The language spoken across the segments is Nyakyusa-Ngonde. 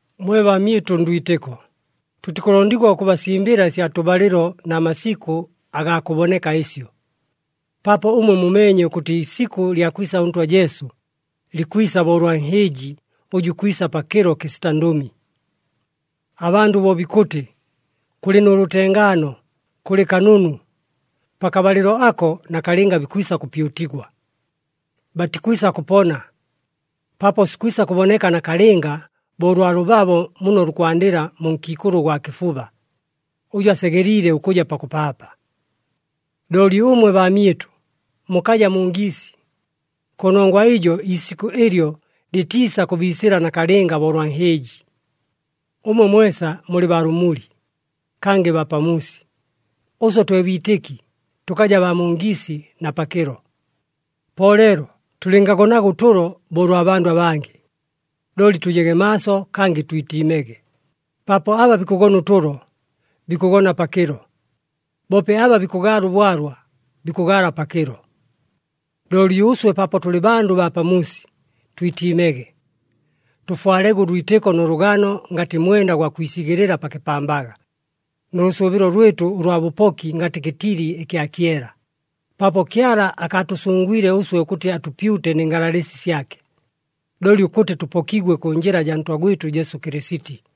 Mwe baamyɨtʉ ndwitɨko, tʉtikʉlondigwa ʉkʉbasimbɨla ɨsya tʉbalɨlo na masikʉ agaa kʉboneka ɨsyo, paapo ʉmwe mumeenye ʉkʉtɨ iisikʉ lya kwisa ʉNtwa Jesu, likwisa bo ʉlwa nhɨɨji ʉjʉ ikwisa pakɨlo kɨsita ndʉmi. Abandʉ bo bikʉtɨ, “Kʉlɨ nʉ lʉtengaano, kʉlɨ kanunu,” pakabalɨlo ako nakalɨnga bikwisa kʉpyutigwa. Batikwisa kʉpona, paapo sikwisa kʉboneka nakalɨnga bo ʉlwa lʉbabo muno lukwandɨla mu nkiikʉlʉ ʉgwa kɨfuba, ʉjʉ asegeliile ʉkʉja pakʉpaapa. Looli ʉmwe baamyɨtʉ, mukaja mu ngiisi. Kʉnongwa ɨjo iisikʉ ɨlyo lɨtiisa kʉbiisɨla nakalɨnga bo ʉlwa nhɨɨji. Ʉmwe mwesa mulɨ baa lʉmuli, kangɨ baa pamuusi. Ʉswe twe biitɨki, tʉkaja baa mu ngiisi na pakɨlo. Po leelo tʉlɨngagonaga ʉtʉlo bo ʉlwa bandʉ abangɨ, looli tʉjege maaso kangɨ twitiimege, paapo aba bikʉgona ʉtʉlo, bikʉgona pakɨlo, boope aba bikʉgaala ʉbwalwa, bikʉgaala pakɨlo. Looli ʉswe, paapo tʉlɨ bandʉ baa pamuusi, twitiimege. Tʉfwalege ʉlwitɨko nʉ lʉgano ngatɨ mwenda gwa kwisigɨlɨla pa kɨpambaga, nʉ lʉsʉʉbɨlo lwɨtʉ ʉlwa bʉpoki ngatɨ kɨtili ɨkya kyela, paapo Kyala akaatʉsʉngwile ʉswe ʉkʉtɨ atʉpyute nɨ ngalalɨsi syake, looli ʉkʉtɨ tʉpokigwe kʉ njɨla jaa Ntwa gwɨtʉ Jesu Kɨlɨsiti.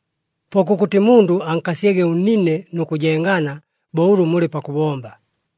Po kʉkʉtɨ mundʉ ankasyege ʉnnine nʉ kʉjengana, bo ʉlʉ mulɨ pakʉbomba.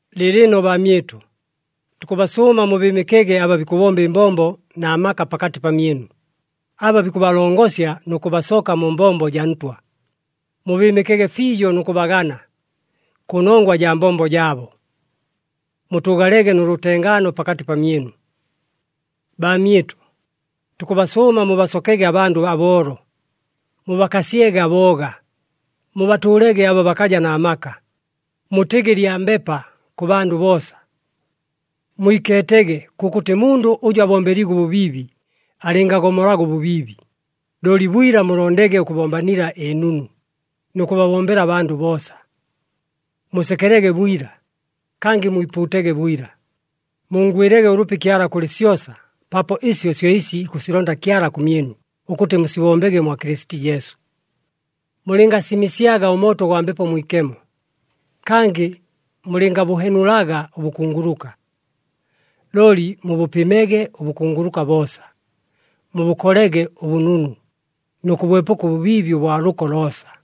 Lɨɨlɨno baamyɨtʉ, tukʉbasʉʉma mubɨɨmɨkege aba bikʉbomba ɨmbombo na maka pakatɨ pamyɨnu, aba bikʉbalongosya nʉ kʉbasoka mu mbombo jaa Ntwa. Mubɨɨmɨkege fiijo nʉ kʉbagana, kʉnongwa jaa mbombo jaabo. Mutʉʉgalege nʉ lʉtengaano pakatɨ pamyɨnu. Baamyɨtʉ, tukʉbasʉʉma mubasokege abandʉ aboolo, mubakasyege abooga, mubatʉʉlege aba bakaja na maka, mutɨgɨ lyambepa kʉ bandʉ boosa. Mwikeetege kʉkʉtɨ mundʉ ʉjʉ abombeliigwe ʉbʉbiibi alɨngagomolaga ʉbʉbiibi, looli bwila mulondege ʉkʉbombanila ɨnunu, nʉ kʉbabombela abandʉ boosa. Musekelege bwila, kangɨ mwipuutege bwila, munngwɨlege ʉlʉpi Kyala kʉlɨ syosa, paapo ɨsyo syo ɨsi ikʉsilonda Kyala kʉmyɨnu ʉkʉtɨ musibombege mwa Kɨlɨsiti Jesu. Mulɨngasimɨsyaga ʉmooto gwa Mbepo Mwikemo, kangɨ mulɨngabʉhenulaga ʉbʉkunguluka, looli mubʉpɨmege ʉbʉkunguluka boosa. Mubʉkolege ʉbʉnunu, nʉ kʉbwepʉka ʉbʉbiibi ʉbwa lʉko loosa.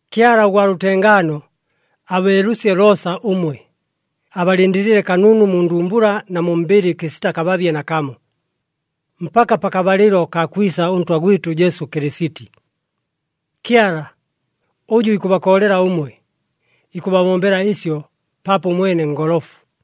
Kyala ʉgwa lʉtengaano abeelʉsye loosa ʉmwe, abalɨndɨlɨle kanunu mu ndumbula na mu mbɨlɨ kɨsita kababye nakamo, mpaka pakabalɨlo kaa kwisa ʉNtwa gwɨtʉ Jesu Kɨlɨsiti. Kyala, ʉjʉ ikʉbakoolela ʉmwe, ikʉbabombela ɨsyo, paapo ʉmwene ngolofu.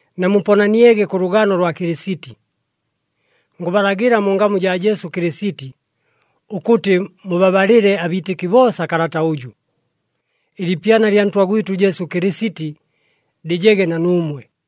Namuponaniege kʉ lʉgano lwa Kɨlɨsiti. Ngʉbalagɨla mu ngamu jaa Jesu Kɨlɨsiti, ʉkʉtɨ mubabalɨle abiitɨki boosa kalata ʉjʉ. Ɨliipyana lya Ntwa gwɨtʉ Jesu Kɨlɨsiti lɨjege na nuumwe.